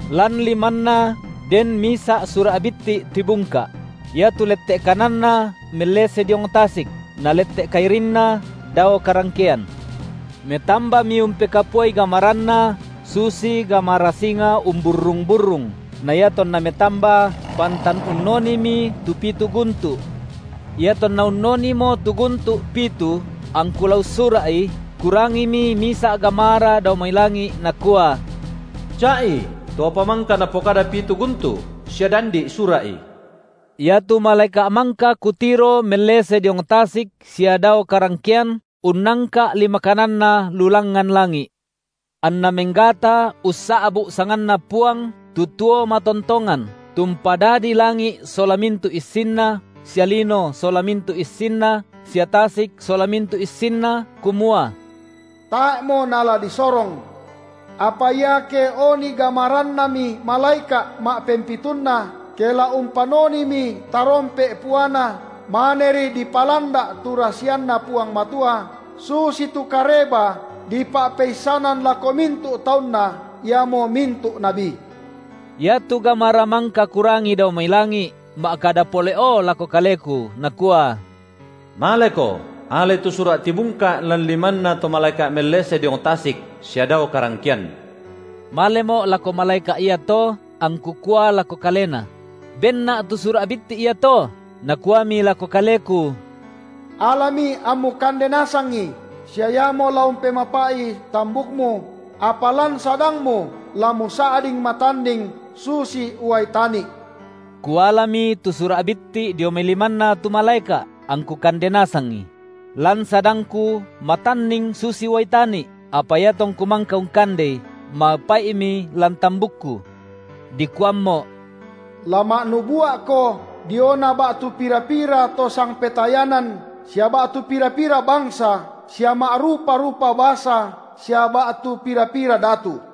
Lan limanna den misa’ sura’ bitti’ tibungka’; iatu lette’ kananna mellese diong tasik, na lette’ kairinna dao karangkean; metambami umpekapuai gamaranna susi gamara singa umburrung-burrung na iatonna metamba, pantan unnonimi tu pitu guntu’. Iatonna unnonimo tu guntu’ pitu, angku la ussura’i, kurangimi misa’ gamara dao mai langi’, nakua: Ca’i to apa mangka napokada pitu guntu’ sia dandi’ sura’i. Iatu malaeka’ mangka kutiro mellese diong tasik sia dao karangkean unnangka’ lima kananna lu langngan langi’, anna menggata ussa’bu’ sanganNa Puang tu tuo matontongan, tu umpadadi langi’ sola mintu’ issinna sia lino sola mintu’ issinna sia tasik sola mintu’ issinna, kumua: tae’mo nala disorong. Apa iake oni gamarannami malaeka’ ma’pempitunna, ke la umpannonimi tarompe’ puana, maneri dipalanda’ tu rasianNa Puang Matua, susitu kareba dipa’peissanan lako mintu’ taunNa, iamo mintu’ nabi. Iatu gamara mangka kurangi dao mai langi’ ma’kada pole’o lako kaleku, nakua: Maleko, alai tu sura’ tibungka’ lan limanna to malaeka’ mellese diong tasik sia dao karangkean. Malemo’ lako malaeka’ iato angku kua lako kalena: Benna’ tu sura’ bitti’ iato. Nakuami lako kaleku: Alami ammu kande nasangi, sia iamo la umpemapai’i tambukmu, apa lan sadangmu la musa’ding matanning susi uai tani’. Kualami tu sura’ bitti’ dio mai limanna tu malaeka’, angku kande nasangi; lan sadangku matanning susi uai tani’, apa iatongku mangka ungkandei, mapai’mi lan tambukku. Dikuammo’: La ma’nubua’ko diona ba’tu pira-pira to sangpetayanan sia ba’tu pira-pira bangsa sia ma’rupa-rupa basa sia ba’tu pira-pira datu.